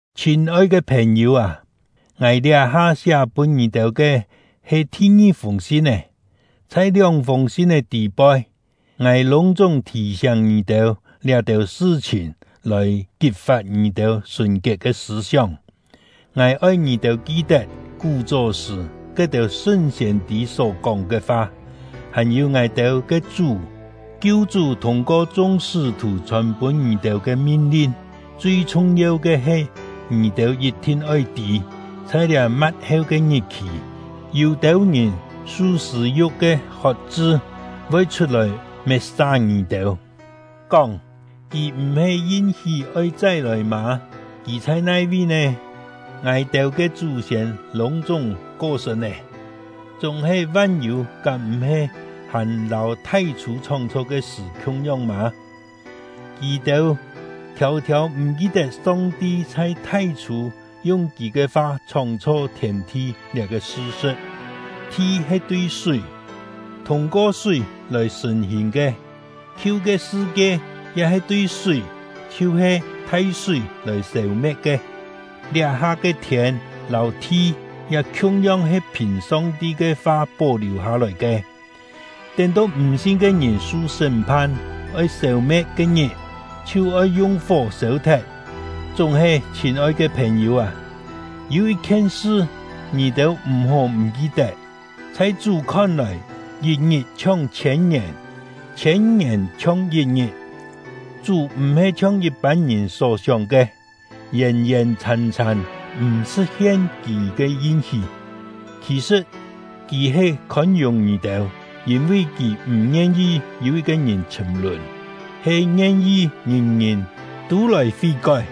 Chhîn-oi ke phèn-yû â, ngài liá-ha siá pûn ngì-têu ke he thi-ngi-fûng sin-é. Chhai lióng-fûng sin-é tî-poi, ngài lûng-chúng thì-siáng ngì-têu liá-têu sṳ-chhìn lòi kit-fat ngì-têu sùn-kiet ke sṳ̂-sióng. Ngài oi ngì-têu ki-tet kú-chó sṳ̀ ke-têu sṳn siên-tî só-kóng ke fa, hàn-yû ngài-têu ke Chú — Kiu-chú thûng-ko chung sṳ́-thù chhòn-pûn ngì-têu ke min-lin. Chui chhung-yeu ke he, ngì-têu yit-thin oi tî, chhai liá ma̍t-heu ke ngit-khì, yû-têu ngìn su sṳ̂-yu̍k ke hot-chṳ, voi chhut-lòi met-sa ngì-têu, kóng: “Kì m̀-he yin-hí oi chai-lòi mâ? Kì chhai nai-vi nè? Ngài-têu ke chú-siên lûng-chúng ko-sṳ̂n lé, chúng-he van-yû kám m̀-he hàn lâu thai-chhû chhóng-chho ke sṳ̀ khiung-yong mâ?” Kì-têu thiâu-thiâu m̀ ki-tet Song-ti chhai thai-chhû yung Kì ke fa chhóng-chho thiên-thi liá-ke sṳ-sṳ̍t. Thi he tui súi, thûng-ko súi lòi sṳ̀n-hìn ke; khiu ke sṳ-kie ya he tui súi, chhiu-he thai-súi lòi sêu-me̍t ke. Liá-ha ke thiên lâu thi ya khiung-yong he phìn Song-ti ke fa pó-liù hâ-lòi ke, tén-to m̀ sin ke ngìn su sṳ́m-phan, oi sêu-me̍t ke-ngit, chhiu oi yung fó sêu-thet. Chúng-he, chhîn-oi ke phèn-yû â, yû yit-khien sṳ ngì-têu m̀-hó m̀ ki-tet: Chhai Chú khon-lòi, yit-ngit chhiong chhiên-ngièn, chhiên-ngièn chhiong yit-ngit. Chú m̀-he chhiong yit-pân ngìn só-sióng ke, yèn-yèn chhàn-chhàn m̀ sṳ̍t-hien Kì ke yin-hí. Khì-sṳ̍t, Kì he khôn-yùng ngì-têu; yîn-vi Kì m̀ ngien-yi yû yit-ke ngìn chhṳ̀m-lùn, he ngien-yi ngìn-ngìn tû lòi fí-kói.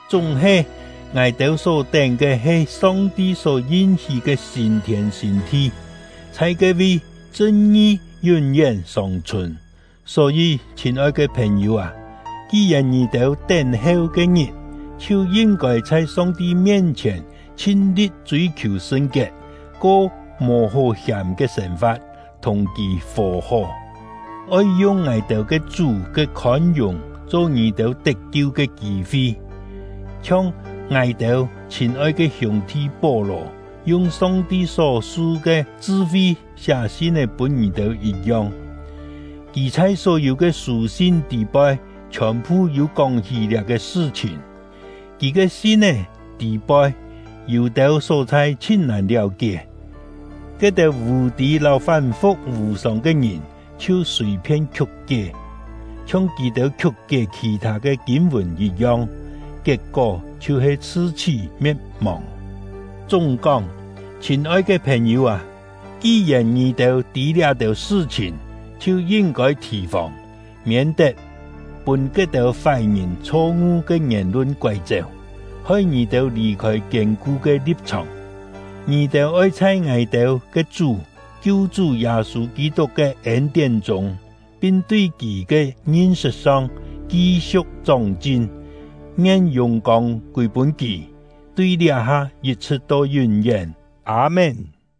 Chúng-he, ngài-têu só tén ke he Song-ti só yin-hí ke sîn-thiên sîn-thi; chhai ke-vi, chṳn-ngi yún-yén sòng-chhùn. Só-yî, chhîn-oi ke phèn-yû â, ki-yèn ngì-têu tén-heu ke-ngit, chhiu yin-kôi chhai Song-ti mien-chhièn chhin-li̍t chûi-khiù sṳn-kiet, ko mò hó hiàm ke sên-fa̍t, thùng Kì fò-hó. Oi yung ngài-têu ke Chú ke khôn-yùng cho ngì-têu tet-kiu ke kî-fi, chhiong ngài-têu chhîn-oi ke hiûng-thi Pó-lò yung Song-ti só su ke chṳ-fi siá sin-é pûn ngì-têu yit-yong. Kì chhai só-yû ke sû-sin tî-poi chhiòn-phu yû kóng-hí liá-ke sṳ-chhìn. Kì ke sin-é tî-poi yû-têu só-chhai chhin-nàn liáu-kié, ke-têu vù-tî lâu fán-fu̍k vù-sòng ke ngìn chhiu sùi-phien khiuk-kié, chhiong kì-têu khiuk-kié khì-thâ ke kîn-vùn yit-yong, kiet-kó chhiu-he chhṳ-chhí me̍t-mòng. Chúng-kóng, chhîn-oi ke phèn-yû â, ki-yèn ngì-têu tî liá-têu sṳ-chhìn, chhiu yin-kôi thì-fòng, miên-tet pûn ke-têu fái-ngìn chho-ngu ke ngièn-lun koái-chéu, hoi ngì-têu lì-khôi kiên-ku ke li̍p-chhòng. Ngì-têu oi chhai ngài-têu ke Chú — Kiu-chú Yâ-sû Kî-tuk ke ên-tién chûng, pin tui kì ke ngin-sṳt song, ki-siu̍k chóng-chin. Ngien yùng-kông kûi-pûn kì, tui liá-ha yit-chhṳ̍t to yún-yén! Â-mén.